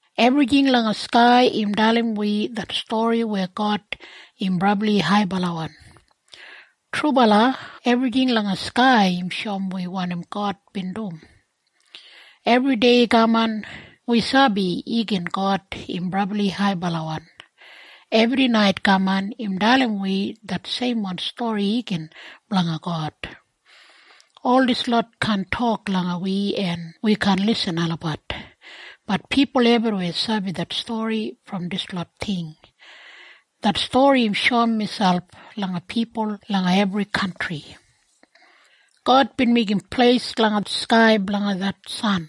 Ebrijing langa skai im dalim wi det stori weya God im brabli haibalawan. Trubala! Ebrijing langa skai im shoum wi wanim God bin dum. Ebri dei kaman, wi sabi igin God im brabli haibalawan. Ebri nait kaman, im dalim wi det seimwan stori igin blanga God. Ol dislot kaan tok langa wi en wi kaan lisin olabat, bat pipul ebriweya sabi det stori brom dislot ting. Det stori im shoum miselp langa pipul langa ebri kantri. God bin meigim pleis langa skai blanga det san.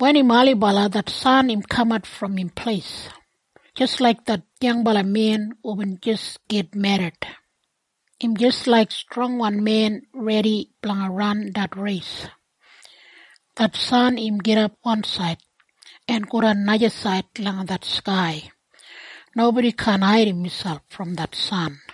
Wen im ailibala det san im kamat brom im pleis, jis laik det yangbala men hubin jis git merrit. Im jis laik strongwan men redi blanga ran det reis. Det san im gidap wansaid, en godan najasaid langa det skai. Nobodi kaan haidim miselp brom det san.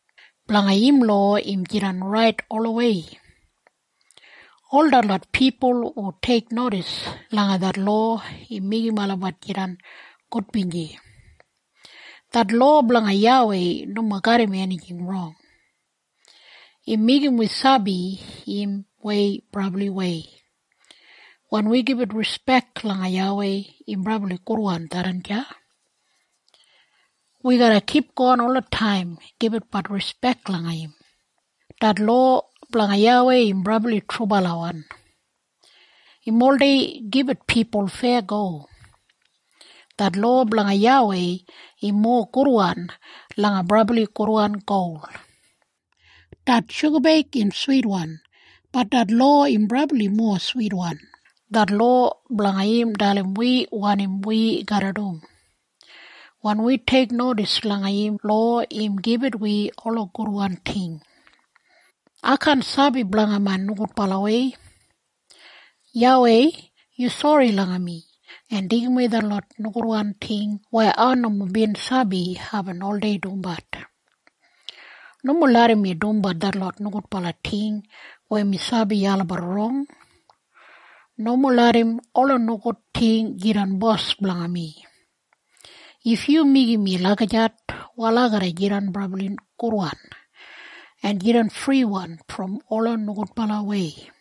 Blanga im lowa im jidan rait olawei. Ol detlot pipul hu teiknodis langa det lowa, im meigim olabat jidan gudbinji. Det lowa blanga YAWEI nomo garram enijing rong. Im meigim wi sabi im wei brabliwei. Wen wi gibit rispek langa YAWEI im brabli gudwan tharran deya. Wi garra kipgon olataim gibitbat rispek langa im. Det lowa blanga YAWEI im brabli trubalawan. Im oldei gibit pipul feyago. Det lowa blanga YAWEI im mowa gudwan langa brabli gudwan gol. Det shugabeig im switwan, Bat det lowa im brabli mowa switwan. Det lowa blanga im dalim wi wanim wi garra dum. Wen wi teiknodis langa im lowa im gibit wi ola gudwan ting. Ai kaan sabi blanga main nogudbalawei. YAWEI, yu sori langa mi en deigimwei detlot nogudwan ting weya ai nomo bin sabi aibin oldei dumbat. Nomo larram mi dumbat detlot nogudwan ting weya mi sabi olabat rong. Nomo larram ola nogud ting jidan bos blanga mi. If yu meigim mi lagijat wal ai garra jidan brabli gudwan, en jidan friwan brom ola nogudbalawei.